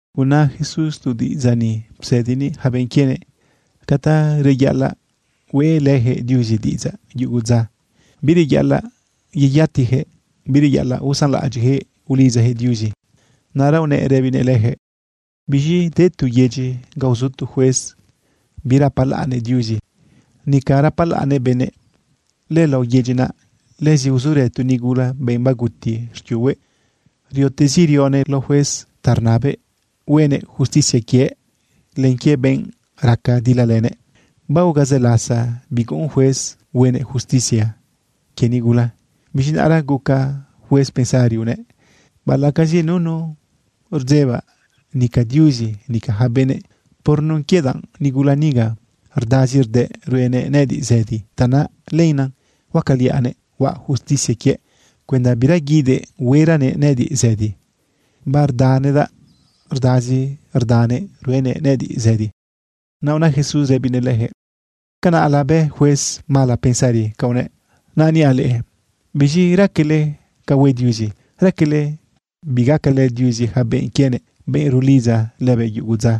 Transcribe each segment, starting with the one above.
Una Jesús tu diꞌidzaꞌ ni psëdinëꞌ yaca benꞌ quienëꞌ ca ta reyaꞌalaꞌ hueꞌlëyaquëꞌ Diuzi diꞌidzaꞌ yugu dza. Bireyaꞌalaꞌ yeyatiyaquëꞌ, bireyaꞌalaꞌ usanlaꞌadyiꞌyaquëꞌ ulidzayaquëꞌ Diuzi. Naꞌra unëꞌ rëbinëꞌ leyaquëꞌ: ―Biz̃i de tu yedyi ga uzu tu juez birapalaꞌnnëꞌ Diuzi, nica rapalaꞌnnëꞌ benëꞌ. Lëlao yedyi naꞌ, lëzi uzurë tu nigula, benꞌ baguti xquiuhue. Riotezi rionëꞌ lao juez ta rnabëꞌ huenëꞌ justicia quiëꞌ len quie benꞌ raca dilalënëꞌ. Baguca zë lasa biguꞌun juez huenëꞌ justicia quie nigula. Biz̃i naꞌra guca juez pensari unëꞌ: “Baꞌalaꞌcazi nunu rdzebaꞌ, nica Diuzi, nica yaca benëꞌ, por nun quie danꞌ nigula niga rdazi rdëꞌ ruenëꞌ nëꞌëdiꞌ zëdi, tanaꞌ lenaꞌ huacaliaꞌnëꞌ huaꞌ justicia quiëꞌ cuenda bira guidëꞌ hueranëꞌ nëꞌëdiꞌ zëdi. Bardanëꞌëdaꞌ rdazi rdanëꞌ ruenëꞌ nëꞌëdiꞌ zëdi.” Naꞌ una Jesús rëbinëꞌ leyaquëꞌ: ―Canaꞌla bë juez mala pensari ca unëꞌ. Naꞌ niaꞌ leꞌe, ¿biz̃i raquele ca hue Diuzi? ¿Raquele bigacalë Diuzi yaca benꞌ quienëꞌ, benꞌ rulidza lëbëꞌ yugu dza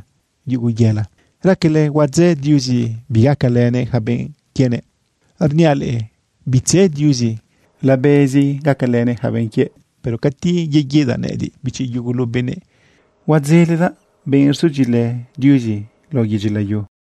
yugu yela? ¿Raquele huadzë Diuzi bigacalënëꞌ yaca benꞌ quienëꞌ? Rniaꞌ leꞌe, bitzë Diuzi. Labezi gacalënëꞌ yaca benꞌ quiëꞌ. Pero cati yeguidaꞌ nëꞌëdiꞌ, bichi yugulu benëꞌ, ¿huadzeledaꞌ benꞌ rzudyiꞌilë Diuzi, lao yedyi layu?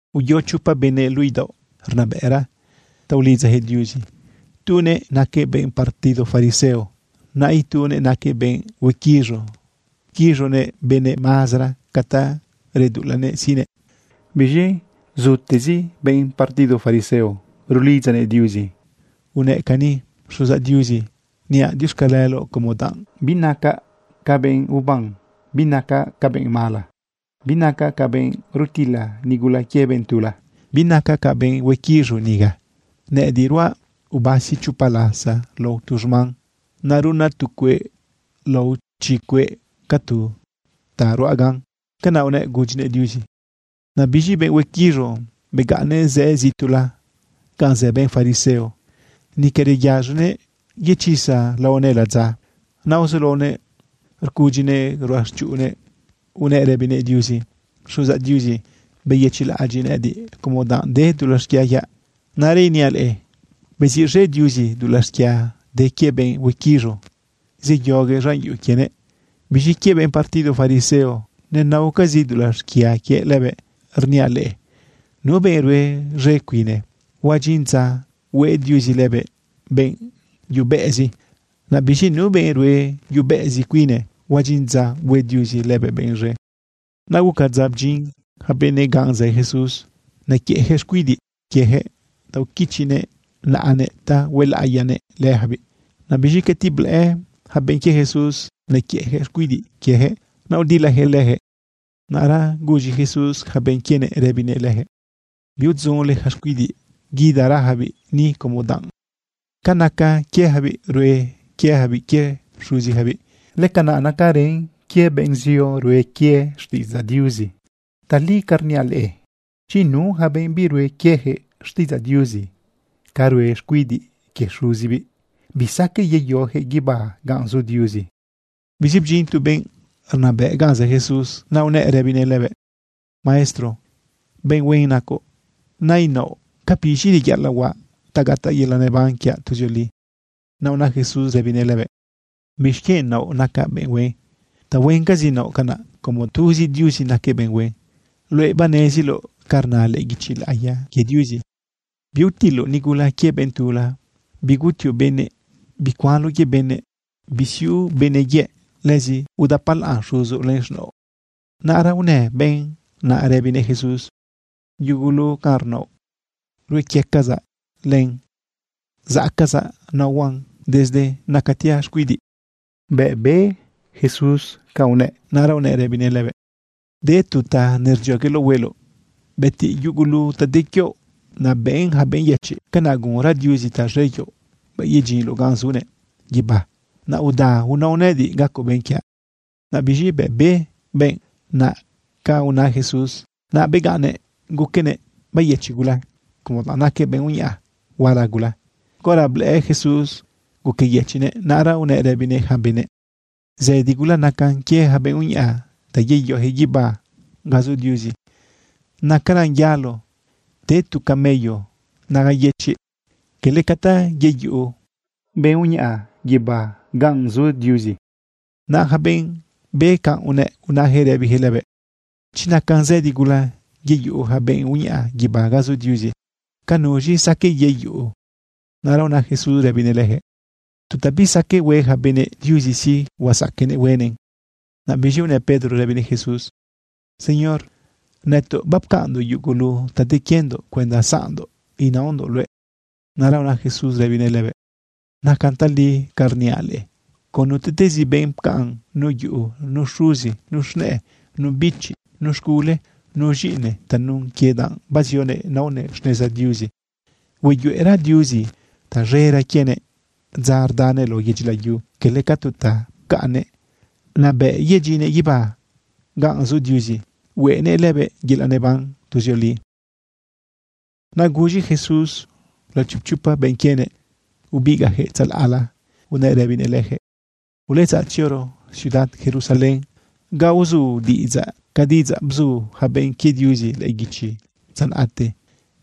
―Uyo chopa benëꞌ luꞌu idaoꞌ rnabëꞌra ta ulidzayaquëꞌ Diuzi. Tunëꞌ naquëꞌ benꞌ partido fariseo. Naꞌ itunëꞌ naquëꞌ benꞌ huequiz̃u pquiz̃unëꞌ benëꞌ mazara ca ta reduꞌulanëꞌ siꞌnëꞌ. Biz̃i zutezi benꞌ partido fariseo rulidzanëꞌ Diuzi unëꞌ cani: “Xuzaꞌ Diuzi, niaꞌ diuxcaleloꞌ como danꞌ binacaꞌ ca benꞌ uban, binacaꞌ ca benꞌ mala, binacaꞌ ca benꞌ rutilë nigula quie benꞌ tula. Binacaꞌ ca benꞌ huequiz̃u niga. Nëꞌëdiꞌ ruaꞌ ubasi chopa lasa lao tu xman. Naꞌ runaꞌ tu cueꞌ lao chi cueꞌ ca tu ta ruaꞌ gan.” Canaꞌ unëꞌ gudyinëꞌ Diuzi. Naꞌ biz̃i benꞌ huequiz̃u, begaꞌnnëꞌ zëꞌ zituꞌla ganꞌ zë benꞌ fariseo. Nica reyaz̃onëꞌ yechisa laonëꞌ ladza. Naꞌ uzulaonëꞌ rcudyinëꞌ ruꞌachuꞌunnëꞌ unëꞌ rëbinëꞌ Diuzi: “Xuzaꞌ Diuzi, beyëchiꞌlaꞌadyiꞌ nëꞌëdiꞌ como danꞌ de dulaꞌ xquia quiaꞌ.” Naꞌra iniaꞌ leꞌe, beziꞌz̃e Diuzi dulaꞌ xquia de quie benꞌ huequiz̃u, zeyoguëꞌ z̃an yuꞌu quienëꞌ. Biz̃i quie benꞌ partido fariseo nenaocazi dulaꞌ xquia quiëꞌ lëbëꞌ. Rniaꞌ leꞌe, nu benꞌ rue z̃e cuine, huadyin dza hue Diuzi lëbëꞌ benꞌ yubeꞌezi. Naꞌ biz̃i nu benꞌ rue yubeꞌezi cuine, huadyin dza hue Diuzi lëbëꞌ benꞌ z̃e. Naꞌ guca dza bdyin yaca benëꞌ ganꞌ zë Jesús, nequiëꞌyaquëꞌ xcuidiꞌ quieyaquëꞌ ta uquichinëꞌ naꞌanëꞌ ta huelaꞌiyanëꞌ leyacabiꞌ. Naꞌ biz̃i cati blëꞌë yaca benꞌ quie Jesús nequiëꞌyaquëꞌ xcuidiꞌ quieyaquëꞌ, naꞌ udilayaquëꞌ leyaquëꞌ. Naꞌra guz̃i Jesús yaca benꞌ quienëꞌ rëbinëꞌ leyaquëꞌ: ―Biudzunle yaca xcuidiꞌ. Guidagarayacabiꞌ ni como danꞌ ca naca quieyacabiꞌ, rue quieyacabiꞌ quie xuziyacabiꞌ, lëcanaꞌ nacarën quie benꞌ zio rue quie xtiꞌidzaꞌ Diuzi. Tali ca rniaꞌ leꞌe, chi nu yaca benꞌ birue quieyaquëꞌ xtiꞌidzaꞌ Diuzi ca rue xcuidiꞌ quie xuzibiꞌ, bisaqueꞌ yeyoyaquëꞌ guibá ganꞌ zu Diuzi. Biz̃i bdyin tu benꞌ rnabëꞌ ganꞌ zë Jesús, naꞌ unëꞌ rëbinëꞌ lëbëꞌ: ―Maestro, benꞌ huen nacoꞌ. Nainaoꞌ, ¿ca biz̃i reyaꞌalaꞌ huaꞌ ta gataꞌ yelaꞌ neban quiaꞌ tuzioli? Naꞌ una Jesús rëbinëꞌ lëbëꞌ: ―¿Bixquienꞌ naoꞌ nacaꞌ benꞌ huen? Tahuencazi naoꞌ canaꞌ, como tuzi Diuzi naquëꞌ benꞌ huen. Luëꞌ baneziloꞌ ca rna lëꞌë guichi laꞌiya quie Diuzi: “Biutiloꞌ nigula quie benꞌ tula. Bigutioꞌ benëꞌ. Bicuanloꞌ quie benëꞌ. Bisiuꞌ benëꞌ yëꞌ. Lëzi udapalaꞌn xuzoꞌ len z̃naoꞌ.” Naꞌra unë benꞌ naꞌ rëbinëꞌ Jesús: ―Yugulu ca rnaoꞌ, ruequiecazaꞌ len zaꞌcazaꞌ naohuaꞌn desde nacatiaꞌ xcuidiꞌ. Bëꞌ be Jesús canꞌ unëꞌ, naꞌra unëꞌ rëbinëꞌ lëbëꞌ: ―De tu ta nerdziogueloꞌ hueloꞌ. Bëtiꞌ yugulu ta de quioꞌ, naꞌ bëꞌn yaca benꞌ yëchiꞌ. Canaꞌ gunra Diuzi taz̃e quioꞌ bëꞌ yedyinloꞌ ganꞌ zunëꞌ guibá. Naꞌ uda unao nëꞌëdiꞌ gacoꞌ benꞌ quiaꞌ. Naꞌ biz̃i bëꞌ be benꞌ naꞌ ca una Jesús, naꞌ begaꞌnnëꞌ guquenëꞌ beyëchiꞌ gula, como danꞌ naquëꞌ benꞌ uñaꞌa huala gula. Caora blëꞌë Jesús guqueyëchiꞌnëꞌ, naꞌra unëꞌ rëbinëꞌ yaca benëꞌ: ―Zëdi gula nacan quie yaca benꞌ uñaꞌa ta yeyoyaquëꞌ guibá ganꞌ zu Diuzi. Nacaran yalo te tu camello naga yëchiꞌ, cala ca ta yeyuꞌu benꞌ uñaꞌa guibá ganꞌ zu Diuzi. Naꞌ yaca benꞌ be canꞌ unëꞌ, unayaquëꞌ rëbiyaquëꞌ lëbëꞌ: ―Chi nacan zëdi gula yeyuꞌu yaca benꞌ uñaꞌa guibá ganꞌ zu Diuzi, ¿ca nuz̃i saqueꞌ yeyuꞌu? Naꞌra una Jesús rëbinëꞌ leyaquëꞌ: ―Tu ta bisaqueꞌ hue yaca benëꞌ, Diuzi sí, huazaqueꞌnëꞌ huenëꞌn. Naꞌ biz̃i unë Pedro rëbinëꞌ Jesús: ―Señor, nëtoꞌ bapcaꞌnndoꞌ yugulu ta de quiendoꞌ cuenda zaꞌndoꞌ inaondoꞌ luëꞌ. Naꞌra una Jesús rëbinëꞌ lëbëꞌ: ―Nacan tali canꞌ rniaꞌ leꞌe. Con nutiꞌtezi benꞌ pcaꞌn nu yuꞌu, nu xuzi, nu z̃nëꞌë, nu bichi, nu z̃gule, nu z̃iꞌine tanun quie danꞌ bazionëꞌ naonëꞌ xneza Diuzi, hueyuꞌera Diuzi taz̃era quienëꞌ dza rdanëꞌ lao yedyi layu cala ca tu ta pcaꞌnnëꞌ. Naꞌ bëꞌ yedyinnëꞌ guibá ganꞌ zu Diuzi, hueꞌnëꞌ lëbëꞌ yelaꞌ neban tuzioli. Naꞌ guz̃i Jesús lao chipchopa benꞌ quienëꞌ ubigaꞌyaquëꞌ tzalaꞌla unëꞌ rëbinëꞌ leyaquëꞌ: ―Uletzaꞌ tzioro ciudad Jerusalén ga uzu diꞌidzaꞌ ca diꞌidzaꞌ bzu yaca benꞌ quie Diuzi lëꞌë guichi dza naꞌte.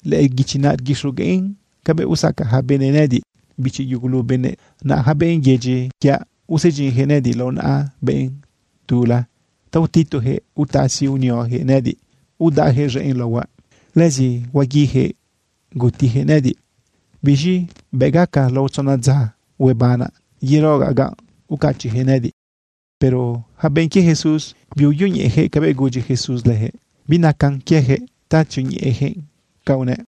Lëꞌë lëguichi naꞌ rguixogueꞌn cabëꞌ usacaꞌ yaca benëꞌ nëꞌëdiꞌ, bichi yugulu benëꞌ. Naꞌ yaca benꞌ yedyi quiaꞌ usedyinyaquëꞌ nëꞌëdiꞌ lao naꞌa benꞌ tula ta utituyaquëꞌ utasi unioyaquëꞌ nëꞌëdiꞌ, udaꞌyaquëꞌ z̃enꞌ laohuaꞌ. Lëzi huaguiyaquëꞌ gutiyaquëꞌ nëꞌëdiꞌ. Biz̃i bëꞌ gaca lao tzona dza, huebanaꞌ yerogaꞌ ganꞌ ucachiꞌyaquëꞌ nëꞌëdiꞌ. Pero yaca benꞌ quie Jesús biuyoñeꞌeyaquëꞌ cabëꞌ gudyi Jesús leyaquëꞌ. Binacan quieyaquëꞌ ta tzioñeꞌeyaquëꞌ canꞌ unëꞌ.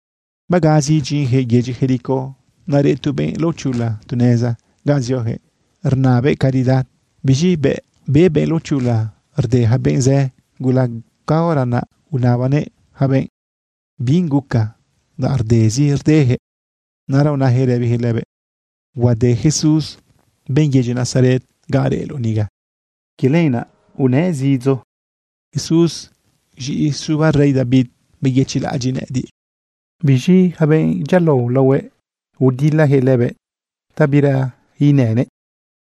Bagazi idyinyaquëꞌ yedyi Jericó, naꞌ reꞌ tu benꞌ laochula tu neza ganꞌ zioyaquëꞌ rnabëꞌ caridad. Biz̃i bëꞌ be benꞌ laochula rde yaca benꞌ zë gula, caora naꞌ unabanëꞌ yaca benꞌ binꞌ guca danꞌ rdezi rdeyaquëꞌ. Naꞌra unayaquëꞌ rëbiyaquëꞌ lëbëꞌ: ―Huade Jesús, benꞌ yedyi Nazaret, ganꞌ reꞌloꞌ niga. Quie lenaꞌ unëꞌ zidzo: ―¡Jesús, z̃iꞌi suba rey David, beyëchiꞌlaꞌadyiꞌ nëꞌëdiꞌ! Biz̃i yaca benꞌ dyialao laohuëꞌ, rdilayaquëꞌ lëbëꞌ ta bira inënëꞌ,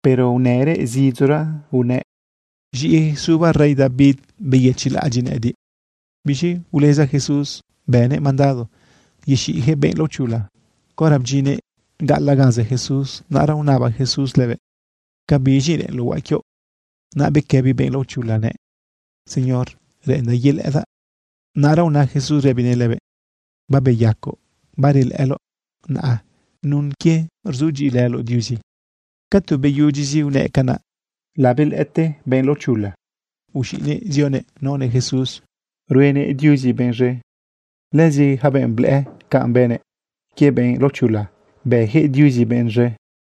pero unërëꞌ zidzora unëꞌ: ―Z̃iꞌi suba rey David, beyëchiꞌlaꞌadyiꞌ nëꞌëdiꞌ. Biz̃i uleza Jesús, bënëꞌ mandado yexiꞌyaquëꞌ benꞌ laochula. Caora bdyinnëꞌ gaꞌalaꞌ ganꞌ zë Jesús, naꞌra unaba Jesús lëbëꞌ: ―¿Ca biz̃i reꞌenloꞌ huaꞌ quioꞌ? Naꞌ bequëbi benꞌ laochula nëꞌ: ―Señor, reꞌendaꞌ yelëꞌëdaꞌ. Naꞌra una Jesús rëbinëꞌ lëbëꞌ: ―Babeyacoꞌ, barelëꞌëloꞌ naꞌa nun quie rzudyiꞌilëloꞌ Diuzi. Ca tu beyudyizi unëꞌ canaꞌ, labelëꞌëte benꞌ laochula, uz̃iꞌnëꞌ zionëꞌ naonëꞌ Jesús ruenëꞌ Diuzi benꞌ z̃e. Lëzi yaca benꞌ blëꞌë canꞌ bënëꞌ quie benꞌ laochula, bëyaquëꞌ Diuzi benꞌ z̃e.